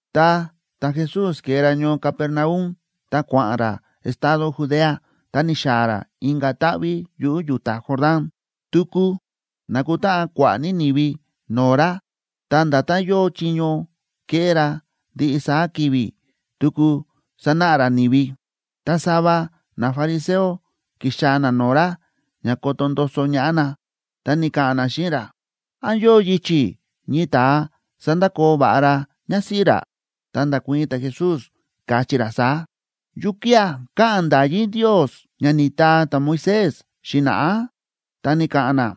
Ta ta̱Jesús ke̱e ra ñoo Capernaum ta kua̱ꞌa̱n ra estado Judea ta ni̱xaa̱ ra inka̱ táꞌví yuꞌu̱ yu̱ta Jordán. Tuku na̱kutáꞌan kua̱ꞌa̱ ní ni̱vi no̱o̱ ra, ta nda̱tán yóo chiño kéꞌé ra ndiꞌi saá ki̱vi̱, tuku sánáꞌa ra ni̱vi. Ta sava nafariseo ki̱xaa̱ na no̱o̱ ra ña koto ndoso ñaꞌá na, ta ni̱ka̱ꞌa̱n na xíꞌin ra: ―¿Án yóo yichi̱ ñii ta̱a sandakoo va̱ꞌa ra ñásíꞌí ra? Ta nda̱kuii̱n ta̱Jesús, káchí ra saá: ―¿Yukía̱ káꞌa̱n nda̱yí Ndios ña ni̱taa ta̱Moisés xi̱na̱ꞌá? Ta ni̱ka̱ꞌa̱n na: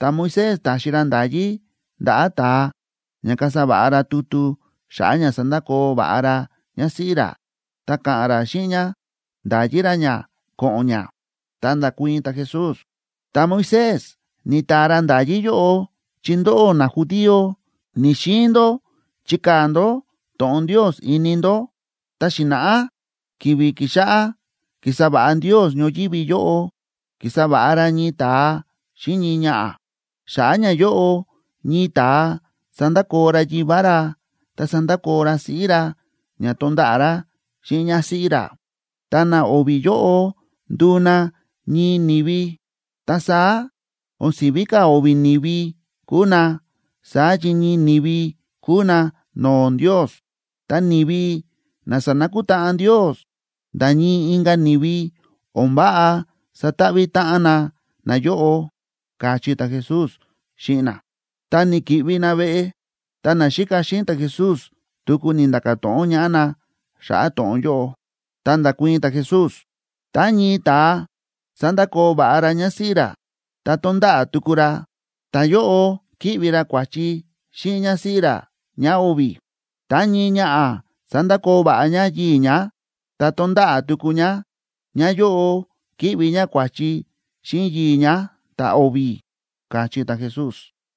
―Ta̱Moisés ta̱xi ra nda̱yí ndaꞌa̱ ta̱a ña kasa va̱ꞌa ra tutu xa̱ꞌa̱ ña sandakoo va̱ꞌa ra ñásíꞌí ra, ta ka̱ꞌa̱n ra xíꞌin ñá nda̱yi ra ñá ko̱ꞌo̱n ñá. Ta nda̱kuii̱n ta̱Jesús: ―Ta̱Moisés ni̱taa ra nda̱yí yóꞌo chi ndóꞌó najudío ni̱‑xiin ndó chikaa̱ ndó to̱ꞌon Ndios ini ndó. Ta xi̱na̱ꞌá ki̱vi̱ ki̱xáꞌá kísa va̱ꞌa Ndios ñoyívi yóꞌo, ki̱sa va̱ꞌa ra ñii ta̱a xíꞌin ñii ñaꞌa̱. Xa̱ꞌa̱ ñayóꞌo ñii ta̱a sandakoo ra yivá ra ta sandakoo ra siꞌí ra ña tonda̱ꞌa̱ ra xíꞌin ñásíꞌí ra, ta na o̱vi̱ yóꞌo nduu na ñii ni̱vi. Ta saá, o̱n si̱ví ka̱ o̱vi̱ ni̱vi kúu na, saá chi ñii ni̱vi kúu na no̱o̱ Ndios. Ta ni̱vi na sa̱nakutáꞌan Ndios, nda̱ ñii inka̱ ni̱vi o̱n váꞌa sataꞌví táꞌan na nayóꞌo ―káchí ta̱Jesús xíꞌin na. Ta ni̱ki̱ꞌvi na veꞌe, ta naxíka xíꞌin ta̱Jesús tuku ni̱nda̱ka̱ to̱ꞌon ñaꞌá na xa̱ꞌa̱ to̱ꞌon yóꞌo. Ta nda̱kuii̱n ta̱Jesús: ―Tá ñii ta̱a sandakoo va̱ꞌa ra ñásíꞌí ra, ta tonda̱ꞌa̱ tuku ra, ta̱yóꞌo ki̱ꞌvi ra kua̱chi xíꞌin ñásíꞌí ra ñáo̱vi̱. Tá ñii ñaꞌa̱ sandakoo va̱ꞌa ñá yii̱ ñá, ta tonda̱ꞌa̱ tuku ñá, ñáyóꞌo ki̱ꞌvi ñá kua̱chi xíꞌin yii̱ ñá ta̱o̱vi̱ ―káchí ta̱Jesús.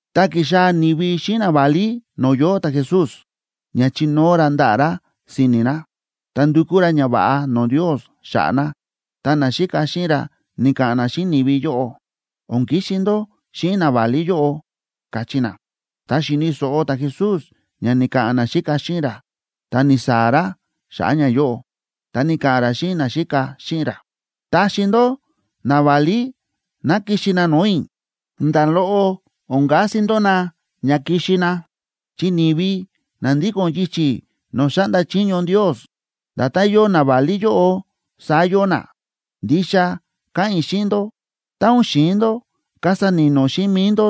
Ta ki̱xaa̱ ni̱vi xíꞌin naválí no̱o̱ yóo ta̱Jesús ña chinóo ra ndaꞌa̱ ra si̱ni̱ na, ta ndukú ra ñava̱ꞌa no̱o̱ Ndios xa̱ꞌa̱ na, ta naxíka xíꞌin ra ni̱ka̱ꞌa̱n na xíꞌin ni̱vi yóꞌo: ―O̱n kixi ndó xíꞌin naválí yóꞌo ―káchí na. Tá xi̱ni̱ so̱ꞌo ta̱Jesús ña ni̱ka̱ꞌa̱n naxíka xíꞌin ra, ta ni̱saa̱ ra xa̱ꞌa̱ ñayóꞌo. Ta ni̱ka̱ꞌa̱n ra xíꞌin naxíka xíꞌin ra: ―Taxi ndó naválí ná kixi na no̱o̱ i̱, nda̱ loꞌo o̱n kasi ndó na ña kixi na, chi ni̱vi na ndíko̱n yichi̱ no̱o̱ xáꞌnda chiño Ndios, nda̱tán yóo naválí yóꞌo, saá yóo na. Ndixa káꞌa̱n i̱ xíꞌin ndó, tá o̱n xi̱in ndó kasa ni̱no̱ xíꞌin mi̱i ndó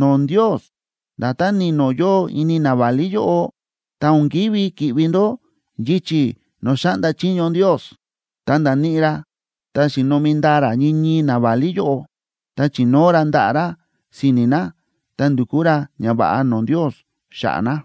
no̱o̱ Ndios, nda̱tán ni̱no̱ yóo ini naválí yóꞌo, ta o̱n kívi ki̱ꞌvi ndó yichi̱ no̱o̱ xáꞌnda chiño Ndios. Ta nda̱níꞌi ra ta xi̱nomi ndaa ra ñii ñii naválí yóꞌo, ta chi̱nóo ra ndaꞌa̱ ra si̱ni̱ na ta ndu̱kú ra ñava̱ꞌa no̱o̱ Ndios xa̱ꞌa̱ na.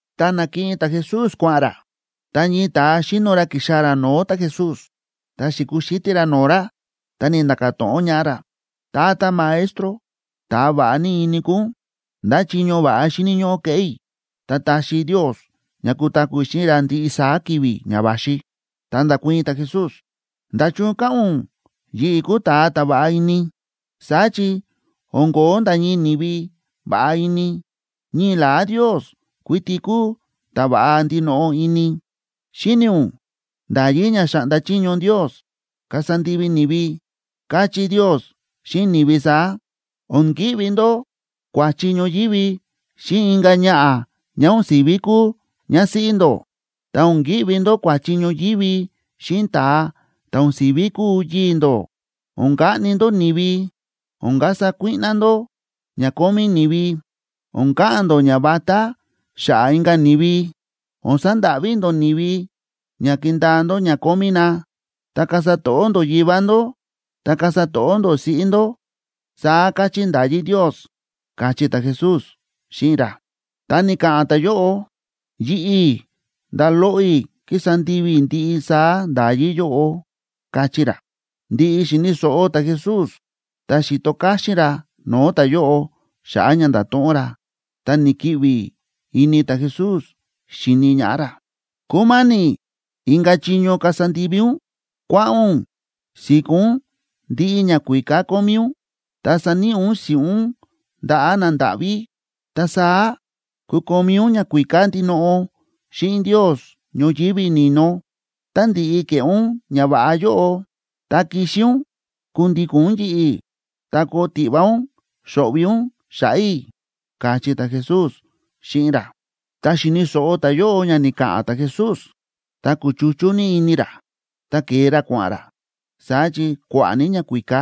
Tá na̱kiꞌin ta̱Jesús kua̱ꞌa̱n ra, ta ñii ta̱a xíno ra ki̱xaa̱ ra no̱o̱ ta̱Jesús, ta xi̱kuxítí ra no̱o̱ ra, ta ni̱nda̱ka̱ to̱ꞌon ñaꞌá ra: ―Tata Maestro, ta̱a va̱ꞌa ini kúu ún, ¿ndá chiño va̱ꞌa xíni̱ ñóꞌó keꞌé i̱, ta taxi Ndios ña kutaku̱ i̱ xíꞌin ra ndiꞌi saá ki̱vi̱ ña va̱xi? Ta nda̱kuii̱n ta̱Jesús: ―¿Nda̱chun káꞌa̱n ún yi̱ꞌi̱ kúu ta̱a ta̱ va̱ꞌa ini? Saá chi o̱n ko̱ó nda̱ ñii ni̱vi va̱ꞌa ini, ñii la̱á Ndios kuiti kúu ta̱ va̱ꞌa ndinoꞌo ini. Xíni̱ ún nda̱yí ña xa̱ꞌnda chiño Ndios kasa ndivi ni̱vi. Káchí Ndios xíꞌin ni̱vi saá: “O̱n ki̱ꞌvi ndó kua̱chi ñoyívi xíꞌin inka̱ ñaꞌa̱ ñá o̱n si̱ví kúu ñásíꞌí ndó, ta o̱n ki̱ꞌvi ndó kua̱chi ñoyívi xíꞌin ta̱a ta̱ o̱n si̱ví kúu yii̱ ndó, o̱n kaꞌni ndó ni̱vi, o̱n kasa kuíꞌná ndó ña kómí ni̱vi, o̱n ka̱ꞌa̱n ndó ñavatá xa̱ꞌa̱ inka̱ ni̱vi, o̱n sandáꞌví ndó ni̱vi ña kindaa ndó ña kómí na, ta kasa to̱ꞌó ndó yivá ndó, ta kasa to̱ꞌó ndó siꞌí ndó”, saá káchí nda̱yí Ndios ―káchí ta̱Jesús xíꞌin ra. Ta ni̱ka̱ꞌa̱n ta̱yóꞌo: ―Yi̱ꞌi̱ nda̱ loꞌo i̱ kísa ndivi i̱ ndiꞌi saá nda̱yí yóꞌo ―káchí ra. Ndi̱ꞌi xi̱ni̱ so̱ꞌo ta̱Jesús ta xi̱to káxín ra no̱o̱ ta̱yóꞌo xa̱ꞌa̱ ña nda̱to̱ꞌon ra, ta ni̱kiꞌvi ini ta̱Jesús xíni ñaꞌá ra. ―Kúma̱ni̱ inka̱ chiño kasa ndivi ún. Kua̱ꞌa̱n ún si̱kó ún ndiꞌi ñakuíká kómí ún, ta saníꞌi ún si̱ꞌún ndaꞌa̱ nandáꞌví. Ta saá kukomí ún ñakuíká ndinoꞌo xíꞌin Ndios ñoyívi ni̱no. Tá ndi̱ꞌi ke̱ꞌé ún ñava̱ꞌa yóꞌo, ta kixi ún kundíko̱n ún yi̱ꞌi̱, ta koo tiꞌva ún xo̱ꞌvi̱ ún xa̱ꞌa̱ i̱ ―káchí ta̱Jesús xíꞌin ra. Ta xi̱ni̱ so̱ꞌo ta̱yóꞌo ña ni̱ka̱ꞌa̱n ta̱Jesús, ta kúchuchú ní ini ra. Ta ke̱e ra kua̱ꞌa̱n ra, saá chi kua̱ꞌa̱ ní ñakuíká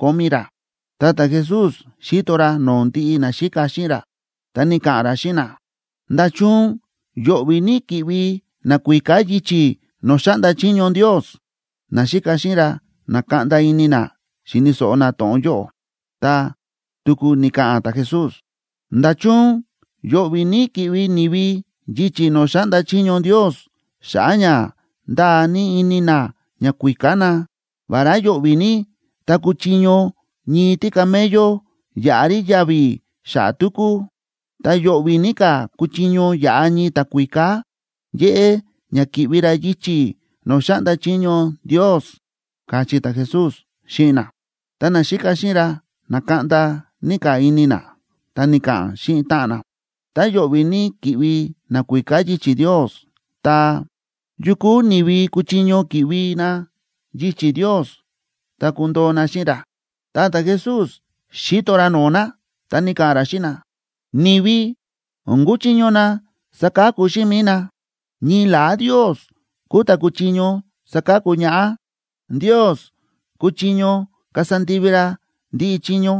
kómí ra. Ta ta̱Jesús xíto ra no̱o̱ ndiꞌi naxíka xíꞌin ra, ta ni̱ka̱ꞌa̱n ra xíꞌin na: ―¡Nda̱chun yo̱ꞌvi̱ ní ki̱ꞌvi nakuíká yichi̱ no̱o̱ xáꞌnda chiño Ndios! Naxíka xíꞌin ra na̱kaꞌnda ini na xíni̱ so̱ꞌo na to̱ꞌon yóꞌo. Ta tuku ni̱ka̱ꞌa̱n ta̱Jesús: ―¡Nda̱chun yo̱ꞌvi̱ ní ki̱ꞌvi ni̱vi yichi̱ no̱o̱ xáꞌnda chiño Ndios xa̱ꞌa̱ ña ndáa ní ini na ñakuíká na! Vará yo̱ꞌvi̱ ní tá kuchiño ñii tícamello yaꞌa rí yavi̱ xa̱ꞌa̱ túkú, ta yo̱ꞌvi̱ ní ka̱ kuchiño yaꞌa ñii ta̱kuíká yéꞌé ña ki̱ꞌvi ra yichi̱ no̱o̱ xáꞌnda chiño Ndios ―káchí ta̱Jesús xíꞌin na. Ta naxíka xíꞌin ra na̱kaꞌnda ní ka̱ ini na, ta ni̱ka̱ꞌa̱n xíꞌin táꞌan na: ―Tá yo̱ꞌvi̱ ní ki̱ꞌvi nakuíká yichi̱ Ndios, ta, ¿yu kúu ni̱vi kuchiño ki̱ꞌvi na yichi̱ Ndios ta kundoo na xíꞌin ra? Ta ta̱Jesús xi̱to ra no̱o̱ na, ta ni̱ka̱ꞌa̱n ra xíꞌin na: ―Ni̱vi o̱n kúchiño na saka̱ku xíꞌin mi̱i na, ñii la̱á Ndios kúu ta̱ kúchiño saka̱ku ñaꞌá. Ndios kúchiño kasa ndivi ra ndiꞌi chiño.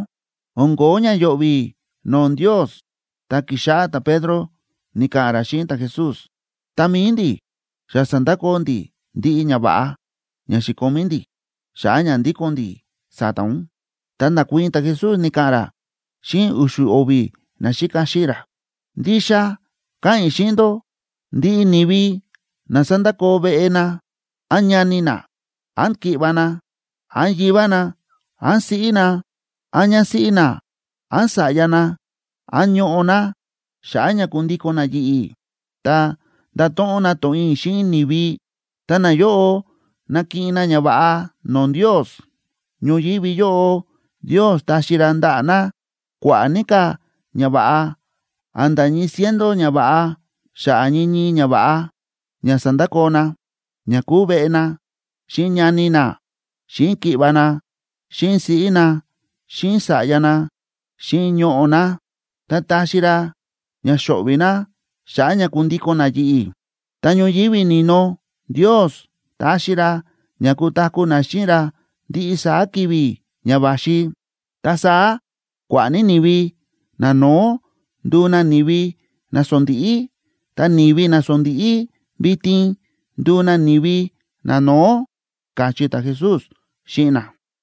O̱n ko̱ó ña yo̱ꞌvi̱ no̱o̱ Ndios. Ta ki̱xáꞌá ta̱Pedro ni̱ka̱ꞌa̱n ra xíꞌin ta̱Jesús: ―Ta mi̱i ndi̱, xa sa̱ndakoo ndi̱ ndiꞌi ñava̱ꞌa ña xi̱komí ndi̱, xa̱ꞌa̱ ña ndíko̱n ndi̱ sa̱ta̱ ún. Ta nda̱kuii̱n ta̱Jesús, ni̱ka̱ꞌa̱n ra xíꞌin u̱xu̱ o̱vi̱ naxíka xíꞌin ra: ―Ndixa káꞌa̱n i̱ xíꞌin ndó, ndiꞌi ni̱vi na sa̱ndakoo veꞌe na, án ñani na, án ki̱ꞌva̱ na, án yivá na, án siꞌí na, án ñásíꞌí na, án sa̱ꞌya na, án ñoꞌo̱ na, xa̱ꞌa̱ ña kundíko̱n na yi̱ꞌi̱ ta ndato̱ꞌon na to̱ꞌon i̱ xíꞌin ni̱vi, ta nayóꞌo nakiꞌin na ñava̱ꞌa no̱o̱ Ndios. Ñoyívi yóꞌo Ndios taxi ra ndaꞌa̱ na kua̱ꞌa̱ ní ka̱ ñava̱ꞌa, a̱nda̱ ñii ciento ñava̱ꞌa xa̱ꞌa̱ ñii ñii ñava̱ꞌa ña sa̱ndakoo na, ña kúu veꞌe na, xíꞌin ñani na, xíꞌin ki̱ꞌva̱ na, xíꞌin siꞌí na, xíꞌin sa̱ꞌya na, xíꞌin ñoꞌo̱ na, ta taxi ra ña xo̱ꞌvi̱ na xa̱ꞌa̱ ña kundíko̱n na yi̱ꞌi̱. Ta ñoyívi ni̱no Ndios taxi ra ña kutaku̱ na xíꞌin ra ndiꞌi saá ki̱vi̱ ña va̱xi. Ta saá kua̱ꞌa̱ ní ni̱vi nano̱ó nduu na ni̱vi nasondíꞌí, ta ni̱vi nasondíꞌí vitin nduu na ni̱vi nano̱ó ―káchí ta̱Jesús xíꞌin na.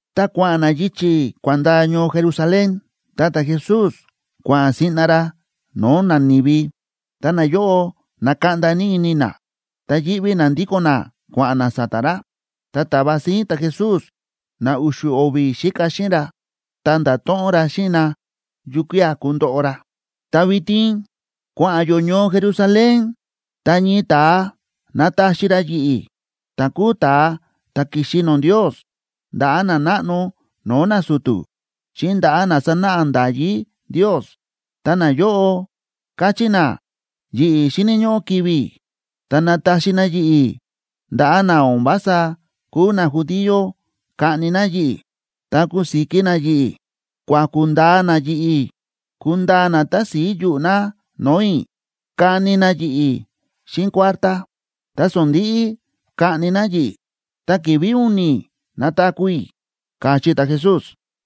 Ta kua̱ꞌa̱n na yichi̱ kua̱n ndaa ñoo Jerusalén, ta ta̱Jesús kua̱ꞌa̱n siꞌna ra no̱o̱ nani̱vi, ta nayóꞌo na̱kaꞌnda ní ini na, ta yíꞌví na ndíko̱n na kua̱ꞌa̱n na sa̱ta̱ ra. Ta ta̱va síín ta̱Jesús na u̱xu̱ o̱vi̱ xíka xíꞌin ra, ta nda̱to̱ꞌon ra xíꞌin na yukía̱ kundoꞌo ra. ―Ta vitin kua̱ꞌa̱n yó ñoo Jerusalén, ta ñii ta̱a nataxi ra yi̱ꞌi̱, ta̱ kúu ta̱a ta̱ ki̱xi no̱o̱ Ndios, ndaꞌa̱ nanáꞌno no̱o̱ nasu̱tu̱, xíꞌin ndaꞌa̱ na sánáꞌa nda̱yí Ndios. Ta nayóꞌo kachí na yi̱ꞌi̱ xíni̱ ñóꞌó kivi̱ i̱, ta nataxi na yi̱ꞌi̱ ndaꞌa̱ na o̱n vása kúu najudío kaꞌni na yi̱ꞌi̱. Ta kusiki na yi̱ꞌi̱, kuaku̱ ndaa na yi̱ꞌi̱, kundaa na tási̱i yuꞌu̱ na no̱o̱ i̱, kani ní na yi̱ꞌi̱ xíꞌin kuártá, ta sondi̱ꞌi kaꞌni na yi̱ꞌi̱. Ta ki̱vi̱ u̱ni̱ nataku̱ i̱ ―káchí ta̱Jesús.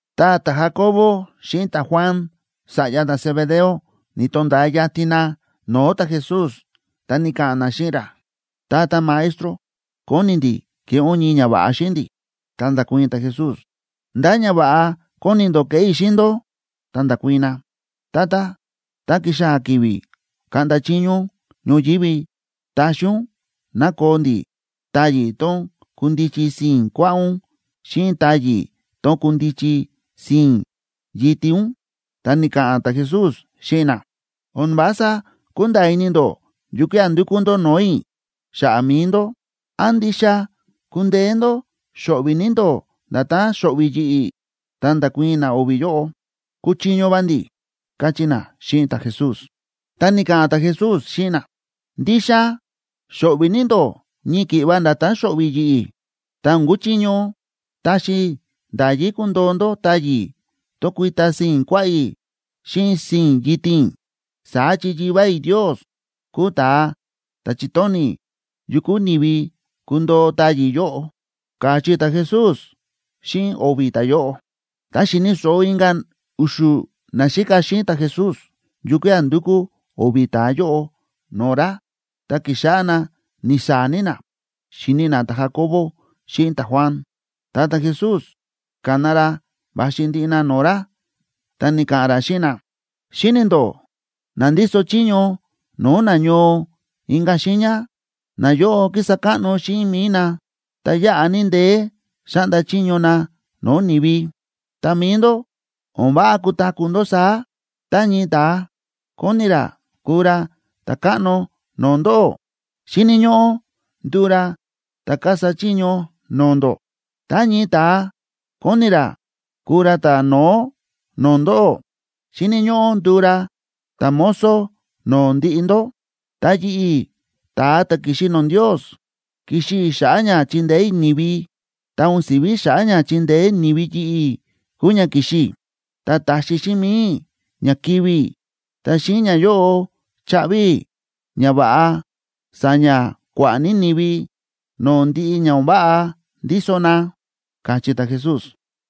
Ta ta̱Jacoboa xíꞌin ta̱Juan, sa̱ꞌya ta̱Zebedeo, ni̱to̱nda̱a yatin na no̱o̱ ta̱Jesús, ta ni̱ka̱ꞌa̱n na xíꞌin ra: ―Tata Maestro, kóni ndi̱ keꞌé ún ñii ñava̱ꞌa xíꞌin ndi̱. Ta nda̱kuii̱n ta̱Jesús: ―¿Ndá ñava̱ꞌa kóni ndó keꞌé i̱ xíꞌin ndó? Ta nda̱kuii̱n na: ―Tata, tá kixaa̱ ki̱vi̱ kaꞌnda chiño ún ñoyívi, taxi ún ná koo ndi̱ táyi̱ tón kundichi sii̱n kuaꞌá ún xíꞌin táyi̱ tón kundichi sii̱n yitin ún. Ta ni̱ka̱ꞌa̱n ta̱Jesús xíꞌin na: ―O̱n vása kúnda̱a̱ ini ndó yukía̱ ndúkú ndó no̱o̱ i̱ xa̱ꞌa̱ mi̱i ndó. ¿Án ndixa kúndeé ndó xo̱ꞌvi̱ ní ndó nda̱tán xo̱ꞌvi̱ yi̱ꞌi̱? Ta nda̱kuii̱n na o̱vi̱ yóꞌo: ―Kúchiño va ndi̱ ―káchí na xíꞌin ta̱Jesús. Ta ni̱ka̱ꞌa̱n ta̱Jesús xíꞌin na: ―Ndixa xo̱ꞌvi̱ ní ndó ñii ki̱ꞌva nda̱tán xo̱ꞌvi̱ yi̱ꞌi̱, ta o̱n kúchiño taxi i̱ nda̱yí kundoo ndó táyi̱ tón kuita sii̱n kuaꞌá i̱ xíꞌin sii̱n yitin i̱. Saá chi Yivá i̱ Ndios kúu ta̱a ta̱ chi̱tóni̱ yu kúu ni̱vi kundoo táyi̱ yóꞌo ―káchí ta̱Jesús xíꞌin o̱vi̱ ta̱yóꞌo. Ta xi̱ni̱ so̱ꞌo inka̱ u̱xu̱ naxíka xíꞌin ta̱Jesús yukía̱ ndu̱kú o̱vi̱ ta̱a yóꞌo no̱o̱ ra, ta ki̱xáꞌá na ni̱saa̱ ní na xíni na ta̱Jacobo xíꞌin ta̱Juan. Ta ta̱Jesús ka̱na ra va̱xi ndiꞌi na no̱o̱ ra, ta ni̱ka̱ꞌa̱n ra xíꞌin na: ―Xíni̱ ndó na ndíso chiño no̱o̱ na ñoo inka̱ xiiña, nayóꞌo kísa káꞌno xíꞌin mi̱i na, ta yáꞌa ní ndeé xáꞌnda chiño na no̱o̱ ni̱vi. Ta mi̱i ndó, o̱n váꞌa kutaku̱ ndó saá. Tá ñii ta̱a kóni ra kuu ra ta̱káꞌno no̱o̱ ndóꞌó, xíni̱ ñóꞌó nduu ra ta̱ kasa chiño no̱o̱ ndó. Tá ñii ta̱a kóni ra kuu ra ta̱no̱ó no̱o̱ ndóꞌó, xíni̱ ñóꞌó nduu ra ta̱mozo no̱o̱ ndiꞌi ndó. Ta yi̱ꞌi̱, ta̱a ta̱ ki̱xi no̱o̱ Ndios, ki̱xi i̱ xa̱ꞌa̱ ña chindeé i̱ ni̱vi, ta o̱n si̱ví xa̱ꞌa̱ ña chindeé ni̱vi yi̱ꞌi̱ kúu ña ki̱xi i̱. Ta taxi xíꞌin mi̱i i̱ ña kivi̱ i̱, ta xíꞌin ñayóꞌo chaꞌvi i̱ ña va̱ꞌa sa̱ña̱ kua̱ꞌa̱ ní ni̱vi no̱o̱ ndiꞌi ña o̱n váꞌa ndíso na ―káchí ta̱Jesús.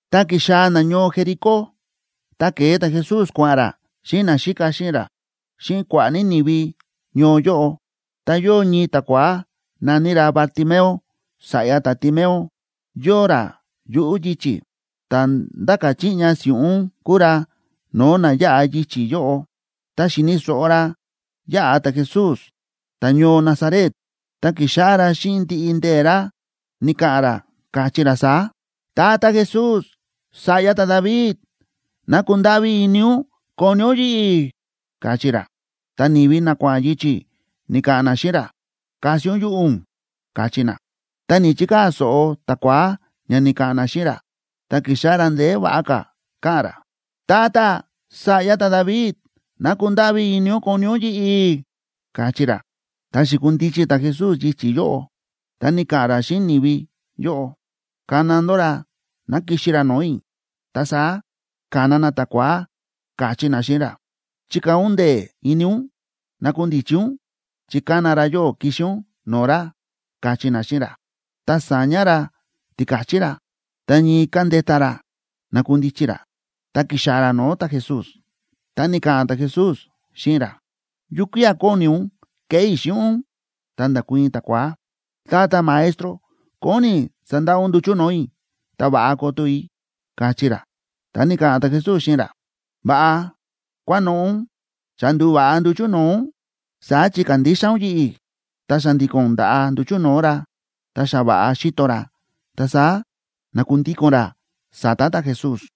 Ta ki̱xaa̱ na ñoo Jericó. Tá ke̱e ta̱Jesús kua̱ꞌa̱n ra xíꞌin naxíka xíꞌin ra xíꞌin kua̱ꞌa̱ ní ni̱vi ñoo yóꞌo, ta yóo ñii ta̱kua̱á na̱ní ra Bartimeo, sa̱ꞌya ta̱Timeo, yóo ra yuꞌu̱ yichi̱. Ta̱ ndáka̱ chiꞌña si̱ꞌún kúu ra no̱o̱ na yáꞌa yichi̱ yóꞌo. Tá xi̱ni̱ so̱ꞌo ra yáꞌa ta̱Jesús, ta̱ñoo Nazaret, ta ki̱xáꞌá ra xíꞌin ndiꞌi ndee̱ ra ni̱ka̱ꞌa̱n ra, káchí ra saá: ―Tata Jesús, sa̱ꞌya ta̱David,b ¡ná kundáꞌví ini ún koni ún yi̱ꞌi̱! ―káchí ra. Ta ni̱vi na kua̱ꞌa̱n yichi̱ ni̱ka̱ꞌa̱n na xíꞌin ra: ―¡Kasi ún yuꞌu̱ ún! ―káchí na. Ta ni̱‑chikaa̱ so̱ꞌo ta̱kua̱á ña ni̱ka̱ꞌa̱n na xíꞌin ra, ta ki̱xáꞌá ra ndeé va̱ꞌa ka̱ káꞌa̱n ra: ―Tata, sa̱ꞌya ta̱David, ¡ná kundáꞌví ini ún koni ún yi̱ꞌi̱! ―káchí ra. Ta xi̱kundichi ta̱Jesús yichi̱ yóꞌo, ta ni̱ka̱ꞌa̱n ra xíꞌin ni̱vi yóꞌo: ―Kana ndó ra ná kixi ra no̱o̱ i̱. Ta saá ka̱na na ta̱kua̱á, káchí na xíꞌin ra: ―Chikaa̱ ún ndee̱ ini ún. Nakundichi ún, chi kána ra yóꞌó kixi ún no̱o̱ ra ―káchí na xíꞌin ra. Ta sa̱ña ra tika̱chí ra, ta ñii ka̱ndeta ra na̱kundichi ra, ta ki̱xaa̱ ra no̱o̱ ta̱Jesús. Ta ni̱ka̱ꞌa̱n ta̱Jesús xíꞌin ra: ―¿Yukía̱ kóni ún keꞌé i̱ xíꞌin ún? Ta nda̱kuii̱n ta̱kua̱á: ―Tata Maestro, kóni i̱ sandaꞌa ún nduchu̱ no̱o̱ i̱ ta va̱ꞌa koto i̱ ―káchí ra. Ta ni̱ka̱ꞌa̱n ta̱Jesús xíꞌin ra: ―Va̱ꞌa kua̱noꞌo̱ ún. Xa ndu̱va̱ꞌa nduchu̱ no̱o̱ ún, saá chi kándixa ún yi̱ꞌi̱. Ta xa̱ndi̱ko̱n nda̱ꞌa nduchu̱ no̱o̱ ra, ta xa va̱ꞌa xíto ra, ta saá na̱kundíko̱n ra sa̱ta̱ ta̱Jesús.